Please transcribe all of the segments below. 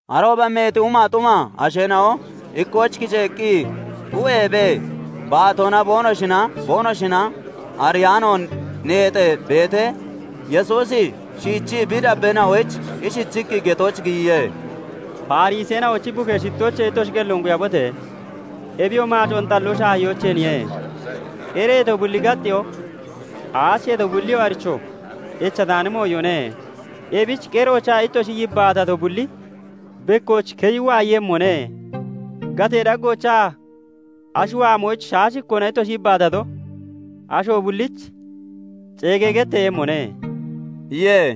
Arooba meeti humaa xuma asheena'o ikkooch kiceeqqi xu'eebee baatoona boonoshinaa boonoshina ariyaanoon neexee beetee, Yesuusi shiichii bi dabbeena'oyich ishichiqqi getooch giyiye; "Fariseena'ochi bukee shittoochee ittoshi qelloon quyabote! Ebiyoo maacoon xalloo shaahiyoocheeniye. Qereeto bulli gaxxeyoo, aacheeto bulliyoo aricho echataani mooyone. Ebich qeroochaa ittoshi yibbaatato bulli bekkooch keyi waayeeyemmone. Gatee daggoochaa ashi waamooch shaashikkoona ittoshi yibbaatato, asho bullich ceegee getteeyemmone" iye.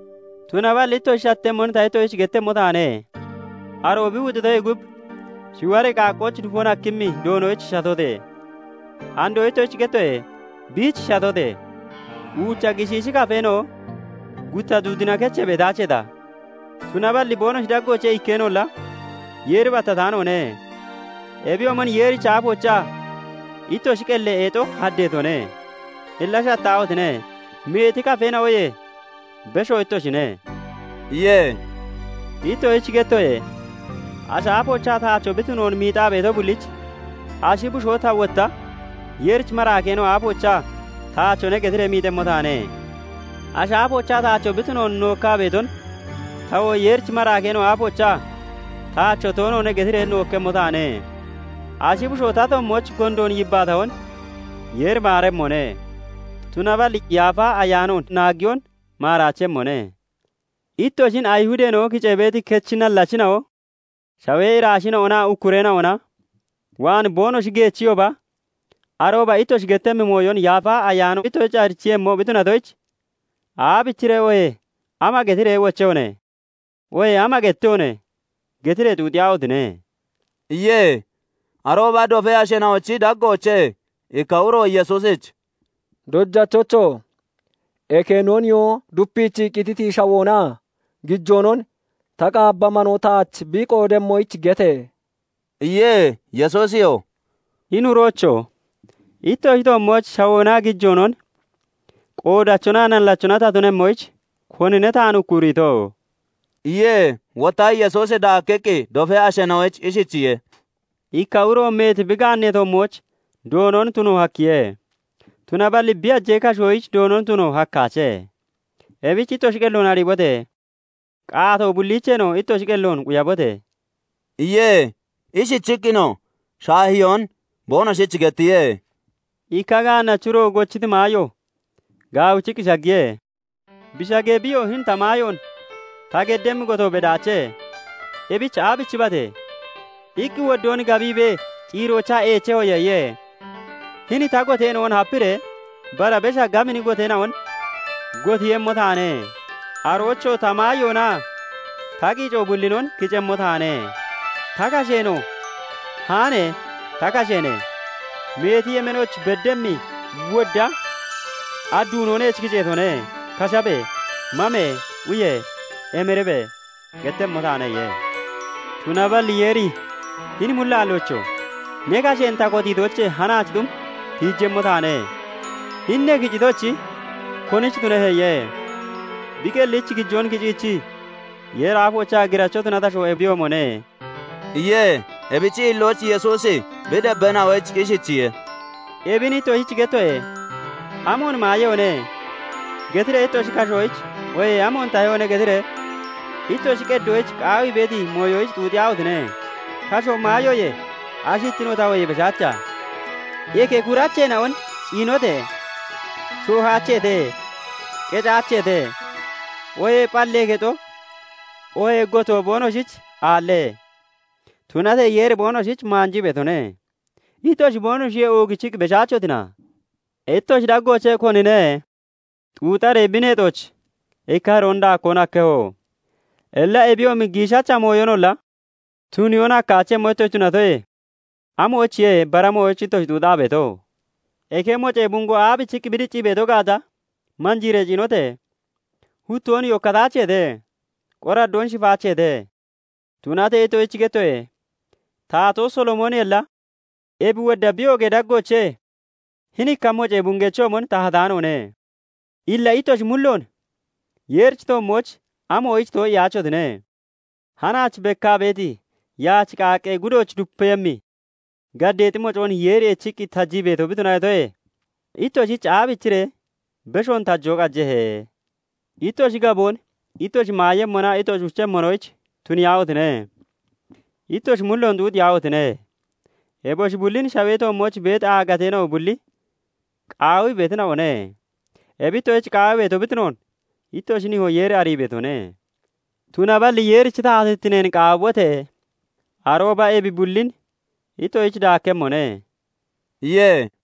Tunaballi ittoshi shattemmon ta ittoshich gettemmo taane; aroo bi wuxitoyee gub, shiwaree qaaqqooch dufon hakkemmi Doonoyich shatote! Andoo ittoshich gettoye; biich shatote! Uucha gishiishi kafeena'o gutta duudina kechee beetaacheeta? Tunaballi boonoshi daggoochee ikkeenolla Yeeri battataanoone. Ebiyoomon Yeerichi aafoochaa ittoshi qelli eexo haddeetone. Illa shattaahotine! Meeti kafeena'oyee beshoo ittoshine" iye. "Ittoshich gettoye; ashi aafoochaa taacho bi tunoon miixaa beeto bullich, ashi bushoo ta wotta Yeerichi maraakeena'o aafoochaa 'Taachone' getiree miixemmo taane; Ashi aafoochaa taacho bi tunoon nookkaa beeton tawoo Yeerichi maraakeena'o aafoochaa 'Taacho toonoone' getiree nookkemmo taane. Ashi bushoo ta toommooch gondoon yibbaatahon Yeeri maaremmone; tunaballi Yaafa Ayaanoon naagiyon maaraachemmone. "Ittoshin Ayihudeena'o kicee beeti kechi nallachina'o, shawee iraasheena'onaa ukkureena'ona waan boonoshi geechiyooba, arooba ittoshi gettemmi mooyon Yaafa Ayaano ittoshich arichiiyemmo bi tunatoyich 'Aabichiree oohee ama getiree wochehone?' oohee 'Ama gettehone?' getiree xuuxiyaahotine!" iye. Arooba dofee asheena'ochi daggoochee ikka uro Yesuusich "Dojachocho! Eke no nihoo dupiichii qititi shawoonaa gijoonon ta qaabba manoo taach bi qoodemmoyich gete!" iye. Yesuusiyoo "Hini uroocho! Ittoshi toommooch shawoonaa gijoonon qoodachonaa nallachona ta tunemmoyich, konine taan ukkuriito?" iye. Wotta Yesuusi daakkiqqi dofee asheena'oyich ishichiye:- "Ikka uro meeti bi gaannee toommooch doonon tuno hakkiye; tunaballi bi hajee kashoyich doonon tuno hakkaache; ebichi ittoshi qelloon ariibote! Qaatoo bulliicheenoo ittoshi qelloon quyabote!" iye. Ishichiqqinoo shaahiyoon boonoshich gettiye:- "Ikka gaannachi uro gochiti maayo gaawichiqqi shaggiye. Bi shagee, biyoo 'Hini ta maayoon ta geddemmi gotoo bedaache; ebich aabichibate?' iqqi woddoo gaabbiibee, ciiroochaa 'Eechehoye' iye. 'Hini ta goteena'on hapiiree bara besha gabini goteena'on gotiiyemmo taane; aroochoo ta maayoonaa ta qiico bullinon kicemmo taane. Ta kasheenoo "Haane ta kasheene! Meeti yemeenooch beddemmi wodda adduunoo neech kiceetone; kashabe! Mame! Uye! Emiribe!" gettemmo taane' iye. "Tunaballi Yeeri 'Hini mullaalloocho! ne kasheen ta kotiitoochee hanaachi xum tiijemmo taane; hini ne kicitochi, konich tunehe?' iye. "Bi qellich gijoon kiciichii Yeeri aafoochaa giracho tunati asho ebiyoomone" iye. Ebichi hillooch Yesuusi bi dabbeena'oyich ishichiye:- "Ebin ittoshich gettoye; 'Amoon maayehone?' getiree ittoshi kashoyich, oohee 'Amoon tahehone?' getiree ittoshi qeddoyich qaawii beeti mooyoyich xuuxiyaahotine! Kashoo maayoye, ashittinoo tahoyee beshaacha? Eke kuracheena'on ciinote! Shoohaacheete; qecaacheete; oohee phallee kexo (afoo) oohee gotoo boonoshich aalle; tunatee Yeeri boonoshich maanjii beetone. Ittoshi boonoshiyee oogichiqqi beshaachotina? Ittoshi daggoochee konine xuuxaree bi neexooch ikka hiroon daakkoon hakkeho? Illa ebiyoomi giishacha mooyonolla tuniyoon hakkaachemmo ittoshi tunatoye, amoyichiye bara mooyoyich ittoshi xuuxaa beeto? "Eke mocee bungoo aabichiqqi bi diccii beeto gaata manjiiree ciinote! Huttoon yokkataache; qoraddoonoo shifaache. Tunatee ittoshich gettoye; taatoo Solomooniyolla ebi wodda bi oogee daggoochee hini ikka mocee bungechoomon tahataanoone. Illa ittoshi mulloon Yeerichi toommooch amoyich too'iyaachotine? Hanaach bekkaa beeti yaach qaaqqee gudooch dupeeyemmi gaddeexi mocoon Yeeri eechiqqi tajii beeto bi tunatoyee, ittoshich aabichiree beshoon tajoo qajehe? Ittoshi gaboon ittoshi maayemmonaa ittoshi uchemmonoyich tuniyaahotine! Ittoshi mulloon xuuxiyaahotine! Eboshi bullin shawee toommooch beeti aagateena'o bulli qaawii beetina'one. Ebi ittoshich qaawii beeto bi tunoon ittoshi nihoo Yeeri arii beetone. Tunaballi Yeerichi taatittineen qaawibote! Arooba ebi bullin ittoshich daakkemmone" iye.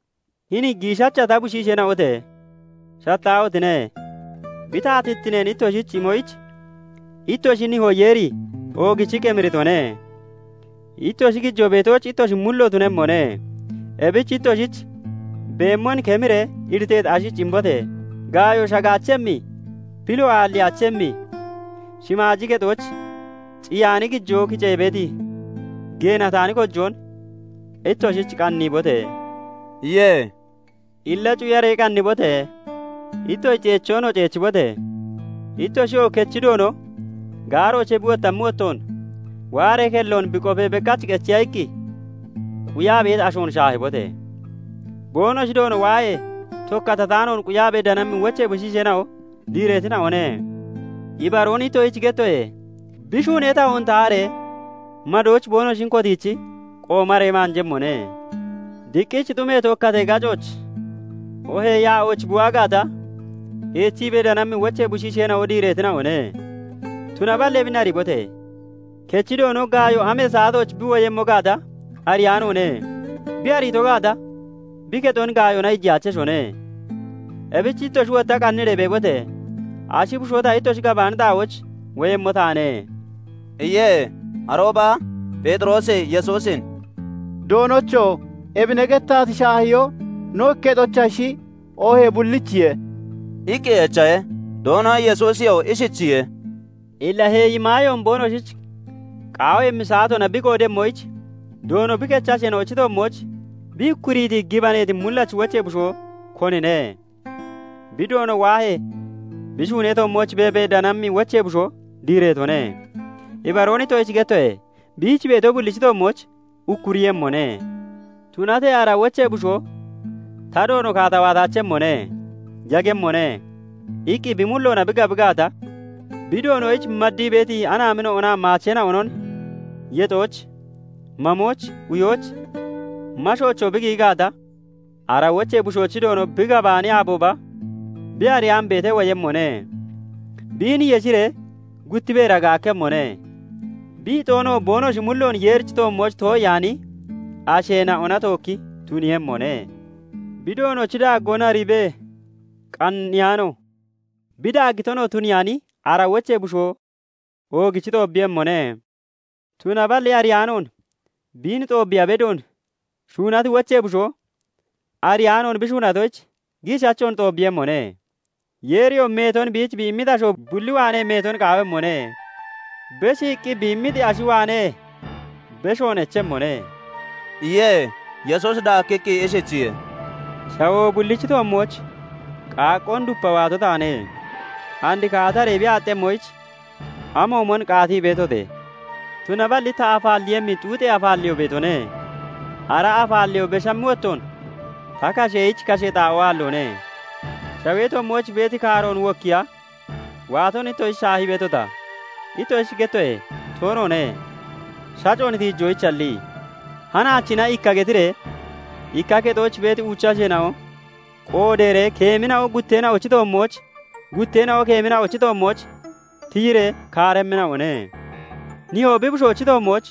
"Hini giishacha ta shiisheena'ote! Shattaahotine! Bi taatittineen ittoshich imoyich ittoshi nihoo Yeeri oogichiqqi emiritone. Ittoshi gijoo beetooch ittoshi mullo tunemmone; ebich ittoshich beemmon kemiree iriteeti ashich imbote! Gaayo shagaachemmi, pilo aalliyaachemmi shimaaji kexooch ciyaani gijoo kicee beeti geenataani kojoon ittoshich qanniibote!" iye. "Illa cuyaree qannibote! Ittoshi ceechoonoo ceechibote! Ittoshiyoo kechi doono gaaroochee bi wottammi wottoon, waaree kelloon bi qofee, bekkach qechiya iqqi quyaa beeti ashoon shaahibote! Boonoshi doono waahee, tokkatataanoon quyaabee danammi wochee bushiisheena'o diireetina'one. Ibaroon ittoshich gettoye; bi shuunee tahoon taharee madooch boonoshin kotiichi qoomaree maanjemmone. Diqqich xumi tokkatee gacooch oohee yaa'ooch bi waa gaata, eechibee danammi wochee bushiisheena'o diireetina'one. Tunaballi ebin ariibote! Kechi Doono gaayo amee saatooch bi woyemmo gaata ariyaanoone; bi ariito gaata, bi kexon gaayoona iijiyaacheshone. Ebich ittoshi wotta qanniree beebote! Ashi bushoo ta ittoshi gabaani xaa'ooch woyemmo taane" iye. Arooba Pheexiroosi Yesuusin "Doonocho! Ebi ne gettati shaahiyoo no ikketoyichashi oohee bullichiye?" iqqi echahe. Doono Yesuusiyoo ishichiye:- "Illa heeyi maayoon boonoshich qaawiimmi saatoona bi qoodemmoyich, doono bi kechi asheena'ochi toommooch bi ukkuriiti gibaneeti mullachi wochee bushoo konine? Bi doono waahee, bi shuunee toommooch beebee danammi wochee bushoo diireetone. Ibaroon ittoshich gettoye; biich beeto bullichi toommooch ukkuriiyemmone. Tunatee ara wochee bushoo 'Ta doono kaata waataachemmone; yagemmone' iqqi bi mulloona bi gabi gaata, bi doonoyich maddii (maddaa) beeti anaamina'onaa maacheena'onon yexooch, mamooch, uyooch, mashoochoo bi giyi gaata, ara wochee bushoochi doono bi gabaani aabooba, bi ariyaan beetee woyemmone; biin yeshiree gutti beera gaakkemmone; bi ixoonoo boonoshi mulloon Yeerichi toommooch too'iyaani asheena'ona tookki tuniiyemmone. "Bi doonochi daaggoon ariibee qanniyaano, bi daaggitonoo tuniyaani ara wochee bushoo oogichi xoobbeeyemmone; Tunaballi ariyaanoon biin xoobiiya bedoon shuunati wochee bushoo ariyaanoon bi shuunatoyich, giishachoon xoobbeeyemmone. Yeeriyoo meeton biich bi immiti asho bulli waanee meeton qaawemmone; beshiiqqi bi immiti ashi waanee beshoon echemmone" iye. Yesuusi daakkiqqi ishichiye:- "Shawoo bullichi toommooch qaaqqoon dupa waato taane; and kaataree bi aaxxemmoyich amoomon qaatii beetote! Tunaballi ta afaalleeyemmi xuuxee afaalleyoo beetone; ara afaalleyoo beshammi wottoon ta kasheyich kasha xaa'oo aalloone. Shawee toommooch beeti kaaroon wokkiiya waaton ittoshich shaahii beetota? Ittoshich gettoye; toonoone, shacoon tiijoyichalli. Hanaachina ikka getiree ikka kexooch beeti uucha asheena'o qoodeeree keemina'o gutteena'ochi toommooch, gutteena'oo keemina'ochi toommooch tiyiree kaaremmina'one. Nihoo bi bushoochi toommooch,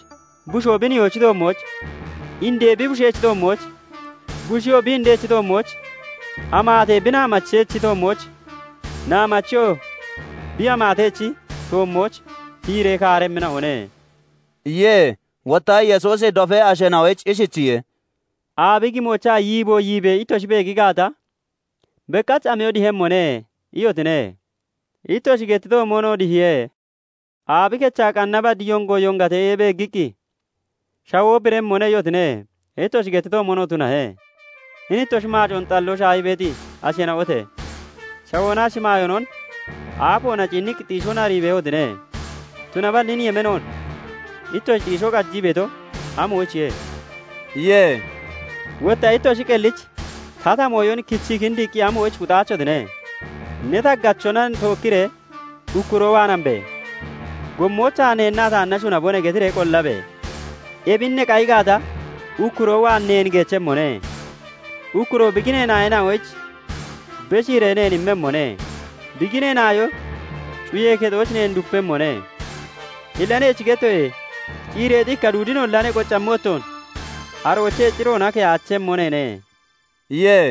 bushoo bi nihoochi toommooch, indee bi bushechi toommooch, busheyoo bi indechi toommooch, amaatee bi naamachechi toommooch, naamacheyoo bi amaatechi toommooch tiyiree kaaremmina'one" iye. Wotta Yesuusi dofee asheena'oyich ishichiye:- "Aabi gimoochaa yiibo yiibee ittoshi beegi gaata, bekkach 'Amiyo dihemmone' iyotine; ittoshi gettitoomonoo dihiye. Aabi kecha qanna baddee yongo yongatee beeggiqqi, 'Shawoo biremmone' iyotine; ittoshi gettitoomonoo tunahe. Hini ittoshi maacoon xalloo shaahii beeti asheena'ote! Shawoonaa shimaayoonon aafoona ciinniqqi xiishoon arii beehotine; tunaballi hini yemeenoon ittoshi xiishoo qajii beeto amoyichiye?" iye. "Wotta ittoshi qellichi tata mooyon kichii kindiiqqi amoyich kuxaachotine? Ne taggachona tookkiree ukkuroo waan hamibee, gommoochaa 'Neennaa taanna shunabone!' getiree qollabe! Ebin ne qayi gaata, ukkuroo waan neen geechiiyemmone; ukkuroo bi ginee naayoyich beshiiree neen immemmone; bi ginee naayoo cuyee kexooch neen dupemmone. Illa neech gettoye; ciireexi ikka duudinolla ne qoccammi wottoon aroochee ciroona keyaachemmo neene" iye.